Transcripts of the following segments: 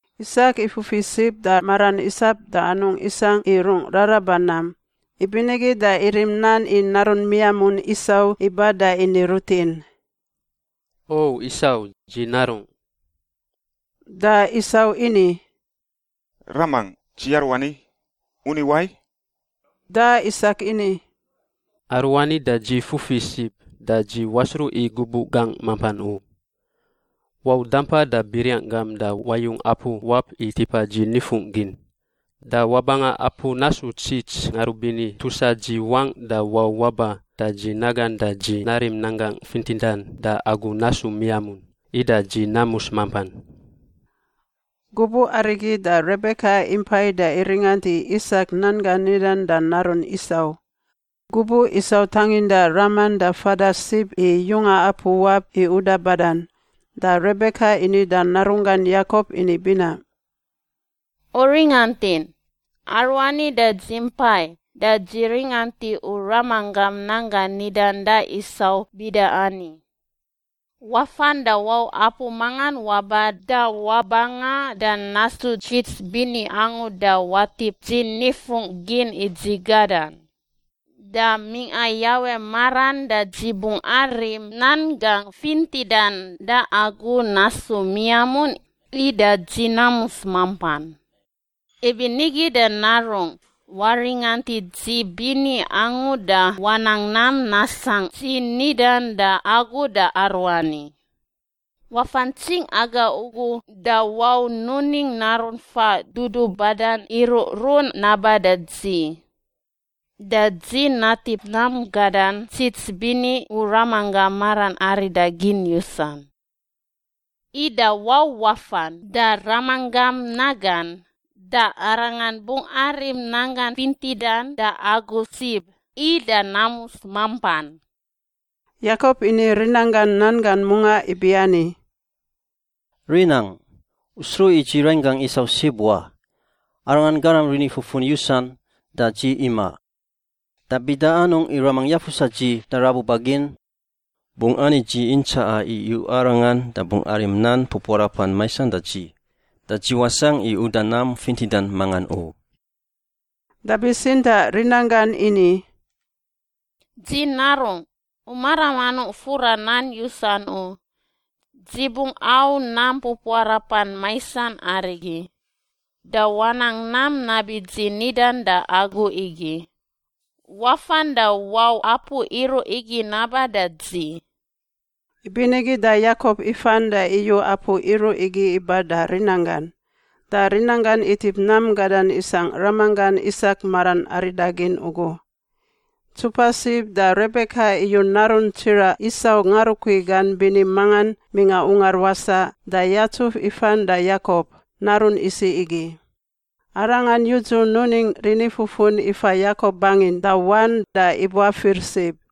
Isak ifufi sib da maran isap da anungꞌ isangꞌ i rungꞌ raraba nam, ibinigi da irim nan i narun miamun Isau iba da ini rutin, “O Isau, dzi narungꞌ.” Da Isau ini, “Ramangꞌ, dzi aruani. U ni wai?” Da Isak ini, “Aruani da dzi fufi sib da dzi wasruꞌ i gubuꞌ gangꞌ mampan u. Wau dampa da biriang gam da wayung apu wap i tipa dzi nifungꞌ gin. Da wabanga apu nasu ntsits ngarubini tusa dzi wangꞌ da wau waba da dzi nagan da dzi narim nan gangꞌ fintidan da agu nasu miamun, ida dzi namus mampan.” Gubuꞌ arigi da Rebeka impai da iringant i Isak nan gan nidan da narun Isau. Gubuꞌ Isau tanginda raman da fada sib i yunga apu wap i uda badan, da Rebeka ini da narunggan Yakop ini binaꞌ, “U ringantin, aruani da dzi mpai da dzi ringant i u ramanggam nan gan nidan da Isau bida ani, ‘Wafan da wau apu mangan waba da wabanga da nasu ntsits bini angu da watip dzi nifungꞌ gin i dzi gadan. Da mingꞌa Yawe maran da dzi bungꞌ arim nan gangꞌ fintidan da agu nasu miamun ida dzi namus mampan.’ Ibinigi da narungꞌ, waringant i dzi bini angu da wanang nam nasangꞌ dzi nidan da agu da aruani: Wafa ntsingꞌ aga ugu da wau nuning naru faꞌ dudubadan iruꞌrun naba da dzi. Da dzi natip nam gadan ntsits bini u ramanggam maran aridagin yusan. Ida wau wafan da ramanggam nagan, da arangan bungꞌ arim nan gan fintidan da agu sib, ida namus mampan.” Yakop ini rinanggan nan gan mungaꞌ ibiani, “Rinangꞌ. U sruꞌ i dzi rainggangꞌ Isau sib wa. Arangan garam rinifufun yusan, da dzi imaꞌ. Da bida anungꞌ i ramangꞌ yafusa dzi da rabuba gin? Bungꞌ ani dzi intsaꞌa i iyuꞌa arangan da bungꞌ arim nan pupuarapan maisan da dzi, da dzi wasangꞌ i uda nam fintidan mangan u.” Da bitsintaꞌ rinanggan ini, “Dzi narungꞌ. U maram anungꞌ fura nan yusan u. Dzi bungꞌ au nam pupuarapan maisan arigi. Da wanang nam nabi dzi nidan da agu igi. Wafan da wau apu iruꞌ igi naba da dzi.” Ibinigi da Yakop ifan da iyu apu iruꞌ igi iba da rinanggan, da rinanggan itip nam gadan isangꞌ ramanggan Isak maran aridagin ugu. Ntsupa sib da Rebeka iyu narun tsiraꞌ Isau ngarukui gan bini mangan mingꞌa ungar wasaꞌ da yatsuf ifan da Yakop, narun isiꞌ igi. Arangan yudzu nuning rinifufun ifa Yakop bangin da wan da ibuafir sib.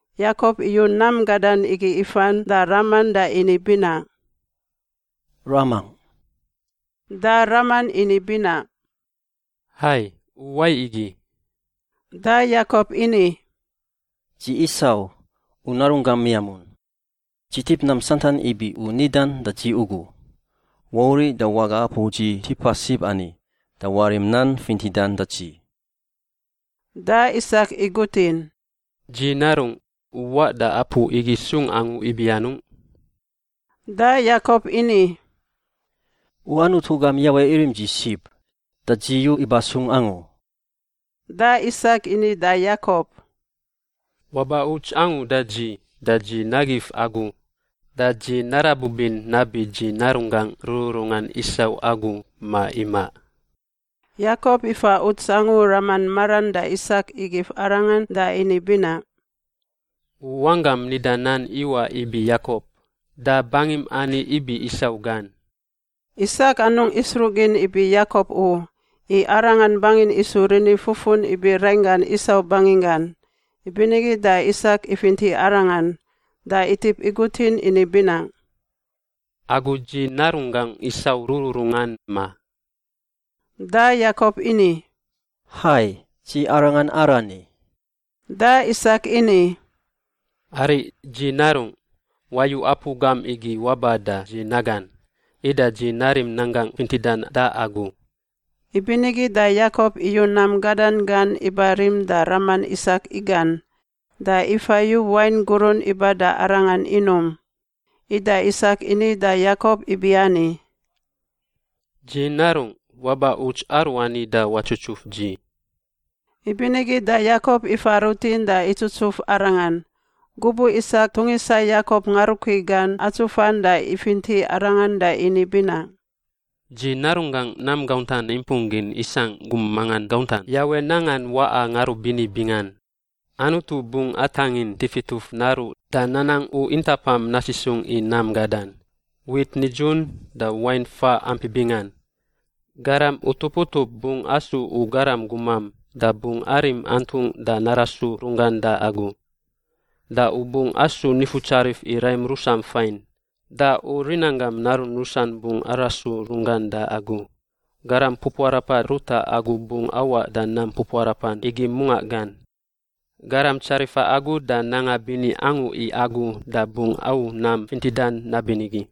Yakop iyu nam gadan igi ifan da raman da ini binaꞌ, “Ramangꞌ.” Da raman ini binaꞌ, “Hai. U wai igi?” Da Yakop ini, “Dzi Isau, u narunggam miamun. Dzi tip nam santan ibi u nidan da dzi ugu. Wauriꞌ da waga apu dzi tipa sib ani da warim nan fintidan da dzi.” Da Isak igutin, “Dzi narungꞌ, u waꞌ da apu igi sung angu ibi anungꞌ?” Da Yakop ini, “U Anutu gam Yawe irim dzi sib, da dzi yu iba sung angu.” Da Isak ini da Yakop, “Waba uts angu da dzi, da dzi nagif agu. Da dzi narabubin nabi dzi narunggangꞌ rururungan Isau agu, ma imaꞌ.” Yakop ifa uts angu raman maran da Isak igif arangan da ini binaꞌ, “U wanggam nida nan iwaꞌ ibi Yakop. Da bangim ani ibi Isau gan.” Isak anungꞌ isruꞌgin ibi Yakop u, i arangan bangin isu rinifufun ibi rainggan Isau banginggan; ibinigi da Isak ifinti arangan. Da itip igutin ini binaꞌ, “Agu dzi narunggangꞌ Isau rururungan, ma?” Da Yakop ini, “Hai, dzi arangan arani.” Da Isak ini, “Ariꞌ, dzi narungꞌ. Wayu apu gam igi waba da dzi nagan, ida dzi narim nan gangꞌ fintidan da agu.” Ibinigi da Yakop iyu nam gadan gan iba rim da raman Isak igan, da ifa yu wain gurun iba da arangan inum. Ida Isak ini da Yakop ibiani, “Dzi narungꞌ, waba uts aruani da watsutsuf dzi.” Ibinigi da Yakop ifa rutin da itsutsuf arangan. Gubuꞌ Isak tungisa Yakop ngarukui gan atsufan da ifinti arangan da ini binaꞌ, “Dzi narunggangꞌ nam gauntan impung gin isangꞌ gum mangan gauntan Yawe nangan waꞌa ngarubini bingan. Anutu bungꞌ atangin tifituf naruꞌ da nanang u intapam nasisungꞌ i nam gadan, wit nidzun da wain faꞌ ampi bingan. Garam utup utup bungꞌ asu u garam gumam da bungꞌ arim antungꞌ da narasu runggan da agu. Da u bungꞌ asu nifutsarif i raim rusam fain, da u rinanggam narun rusan bungꞌ arasu runggan da agu. Garam pupuarapa ruta agu bungꞌ awaꞌ da nam pupuarapan igi mungaꞌ gan. Garam tsarifa agu da nanga bini angu i agu da bungꞌ au nam fintidan nabinigi.”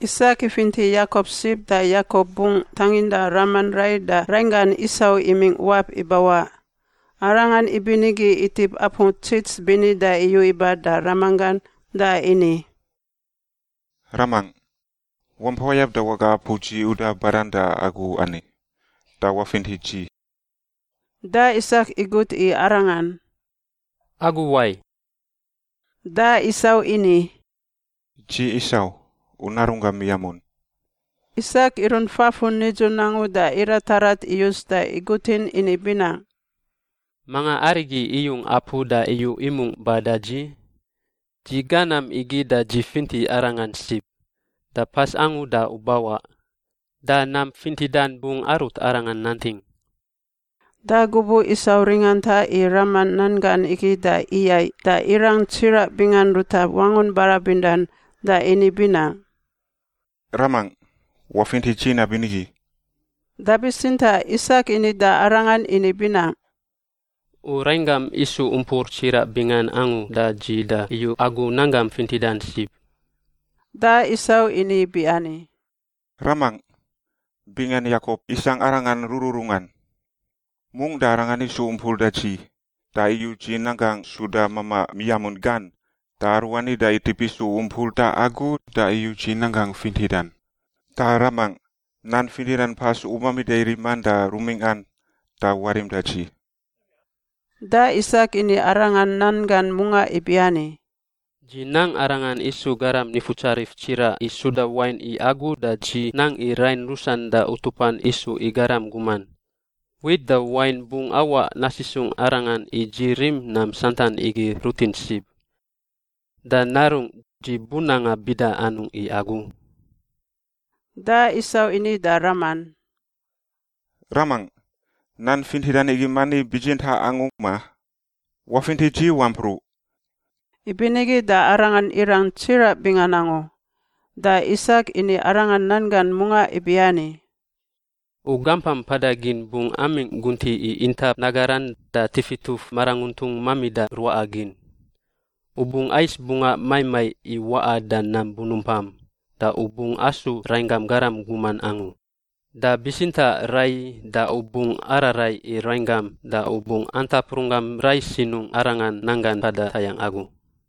Isak ifinti Yakop sib da Yakop bungꞌ tanginda raman rai da rainggan Isau imingꞌ wap ibawaꞌ. Arangan ibinigi itip apu ntsits bini da iyu iba da ramanggan da ini, “Ramangꞌ, wampa wayab da waga apu dzi uda badan da agu ani, da wafinti dzi.” Da Isak igut i arangan, “Agu wai?” Da Isau ini, “Dzi Isau, u narunggam miamun.” Isak irunt fafun nidzun angu da iratarat iyus da igutin ini binaꞌ, “Manga arigi iyung apu da iyu imungꞌ ba da dzi? Dzi ga nam igi da dzi finti arangan sib, da pas angu da u bawaꞌ. Da nam fintidan bungꞌ arut arangan nanting.” Da gubuꞌ Isau ringanta i raman nan gan igi da iyaiꞌ da irang tsiraꞌ bingan ruta wangun barabindan da ini binaꞌ, “Ramangꞌ, wafinti dzi nabinigi!” Da bitsintaꞌ Isak ini da arangan ini binaꞌ, “U rainggam isu umpur tsiraꞌ bingan angu da dzi da iyu agu nan gam fintidan sib.” Da Isau ini ibiani, “Ramangꞌ! Bingan Yakop isangꞌ arangan rururungan. Mungꞌ da arangan isu umpur da dzi, da iyu dzi nanggangꞌ suda mamaꞌ miamun gan. Da aruani da itip isu umpur da agu, da iyu dzi nan gangꞌ fintidan. Da ramangꞌ, nan fintidan pas u mamida riman da rumingꞌan, da warim da dzi.” Da Isak ini arangan nan gan mungaꞌ ibiani, “Dzi nang arangan isu garam nifutsarif tsiraꞌ i suda wain i agu, da dzi nang i rain rusan da utupan isu i garam guman. Wit da wain bungꞌ awaꞌ nasisungꞌ arangan i dzi rim nam santan igi rutin sib. Da narungꞌ, dzi bunanga bida anungꞌ i agu?” Da Isau ini da raman, “Ramangꞌ, nan fintidan igi mani bitsintaꞌ angu, ma? Wafinti dzi wampruꞌ!” Ibinigi da arangan irang tsiraꞌ bingan angu. Da Isak ini arangan nan gan mungaꞌ ibiani, “U gampam mpada gin bungꞌ amingꞌ guntiꞌ i intap nagaran da tifituf maranguntun mamida ruaꞌa gin. U bungꞌ ais bungaꞌ maiꞌ maiꞌ i waꞌa da nam bunumpam da u bungꞌ asu rainggam garam guman angu. Da bitsintaꞌ raiyi da u bungꞌ araraiꞌ i rainggam da u bungꞌ antap runggam rai sinungꞌ arangan nanggan mpada tayangꞌ agu.”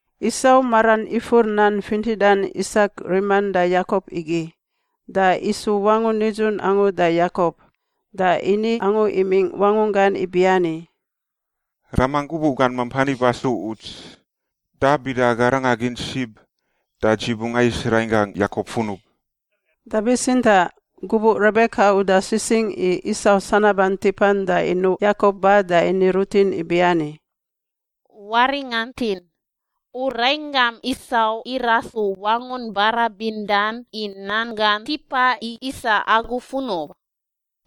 Isau maran ifur nan fintidan Isak riman da Yakop igi, da isu wangun nidzun angu da Yakop. Da ini angu imingꞌ wangunggan ibiani, “Ramangꞌ gubuꞌ gan mampan iba su uts, da bida aga ranga gin sib, da dzi bungꞌ ais rainggangꞌ Yakop funub.” Da bitsintaꞌ gubuꞌ Rebeka uda sisingꞌ i Isau sanaban tipan da inuꞌ Yakop ba da ini rutin ibiani, “Waringantin, u rainggam Isau irasu wangun barabindan i nan gan tipa i isa agu funub.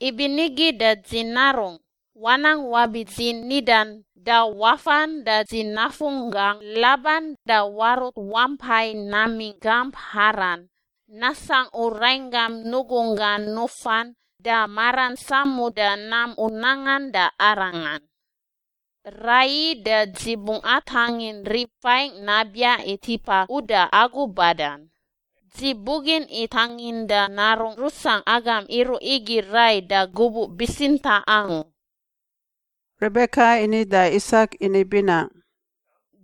Ibinigi da dzi narungꞌ, wanang wabi dzi nidan, da wafan da dzi nafunggangꞌ Laban da warut wampai namingꞌ gamp Haran, nasangꞌ u rainggam nugunggan nufan da maran samuda nam u nangan da arangan. Raiyi da dzi bungꞌ atangin rib fain nabiaꞌ i tipa uda agu badan. Dzi bugin i tanginda narungꞌ rusangꞌ agam iruꞌ igi rai da gubuꞌ bitsintaꞌ angu.” Rebeka ini da Isak ini binaꞌ,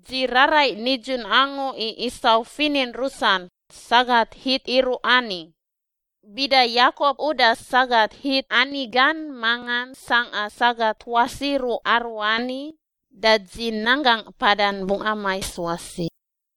“Dzi raraiꞌ nidzun angu i Isau finin rusan, sagat Hit iruꞌ ani. Bida Yakop uda sagat Hit ani gan mangan sangꞌa sagat tuas iruꞌ aruani, da dzi nanggangꞌ mpadan bungꞌ amais wasi.”